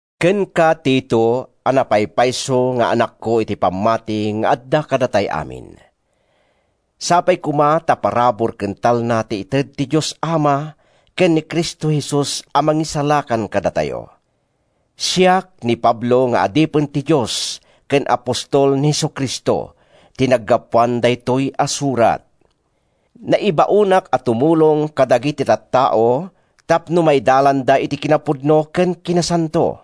Kenka, Tito, a napaypayso nga anakko iti pammati nga adda kadatay amin: Sapay koma ta parabur ken talna ti ited ti Dios Ama ken ni Cristo Jesus a Mangisalakan kadatayo. Siak, ni Pablo nga adipen ti Dios ken apostol ni Jesu-Cristo, ti naggapuan daytoy a surat. Naibaonak a tumulong kadagiti tattao tapno maidalanda iti kinapudno ken kinasanto.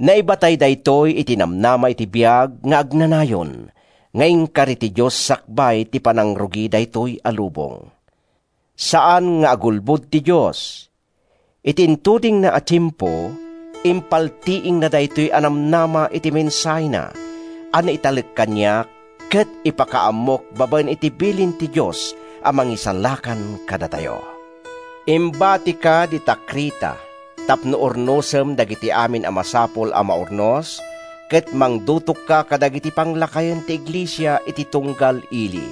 Naibatay daytoy iti namnama iti biag nga agnanayon nga inkari ti Dios sakbay ti panangrugi daytoy a lubong. Saan nga agulbod ti Dios. Iti intudingna a tiempo, impaltiingna daytoy a namnama iti mensahena a naitalek kaniak ket ipakaammok babaen iti bilin ti Dios a Mangisalakan kadatayo. Imbatika dita Creta tapno urnosem dagiti amin a masapul a maurnos ket mangdutokka kadagiti panglakayen ti iglesia iti tunggal ili.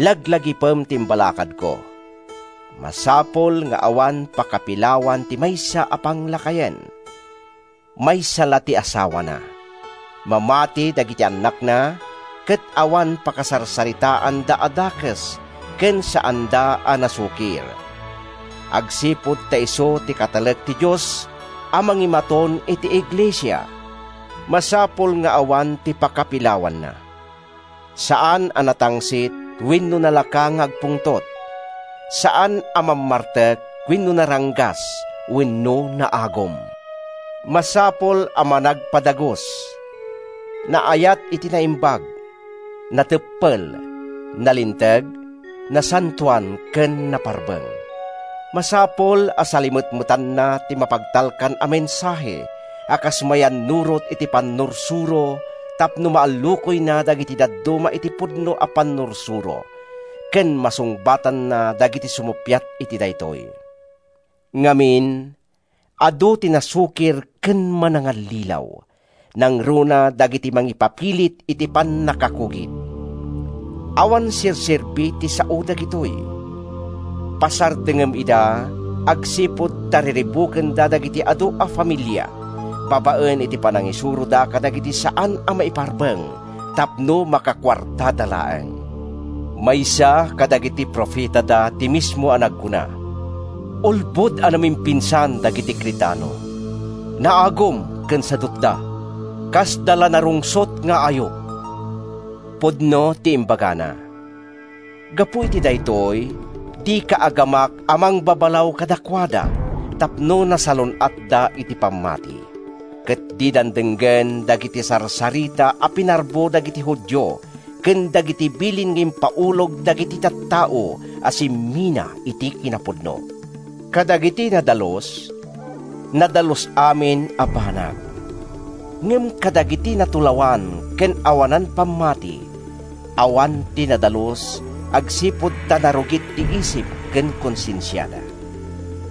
Laglagipem ti imbalakadko: Masapul nga awan pakapilawan ti maysa a panglakayen. Maysa la ti asawana. Mamati dagiti annakna ket awan pakasarsaritaanda a dakes ken saanda a nasukir. Agsipud ta isu ti katalek ti Dios a mangimaton iti iglesia, masapul nga awan ti pakapilawanna. Saan a natangsit wenno nalaka nga agpungtot. Saan a mammartek wenno naranggas wenno naagum. Masapul a managpadagus, naayat iti naimbag, nateppel, nalinteg, nasantoan ken naparbeng. Masapul a salimetmetanna ti mapagtalkan a mensahe a kas mayannurot iti pannursuro tapno maallukoyna dagiti dadduma iti pudno a pannursuro ken masungbatanna dagiti sumuppiat iti daytoy. Ngamin, adu ti nasukir ken manangallilaw, nangruna dagiti mangipapilit iti pannakakugit. Awan serserbi ti sao dagitoy. Pasardengem ida agsipud ta riribukenda dagiti adu a familia babaen iti panangisuroda kadagiti saan a maiparbeng tapno makakuartada laeng. Maysa kadagiti profetada ti mismo a nagkuna: “Ulbod a namimpinsan dagiti Cretano. Naagum ken sadutda, kasdala narungsot nga ayup.” Pudno ti imbagana. Gapu iti daytoy, dika agamak a mangbabalaw kadakuada tapno nasalun-atda iti pammati, ket didan denggen dagiti sarsarita a pinarbo dagiti Judio ken dagiti bilin nga impaulog dagiti tattao a simmina iti kinapudno. Kadagiti nadalus, nadalus amin a banag. Ngem kadagiti natulawan ken awanan pammati, awan ti nadalus, agsipud ta narugit ti isip ken konsensiada.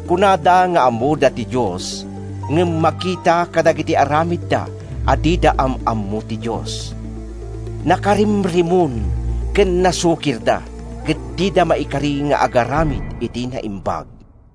Kunada nga ammoda ti Dios ngem makita kadagiti aramidda a dida am-ammo ti Dios. Nakarimrimon ken nasukirda, ket dida maikari nga agaramid iti naimbag.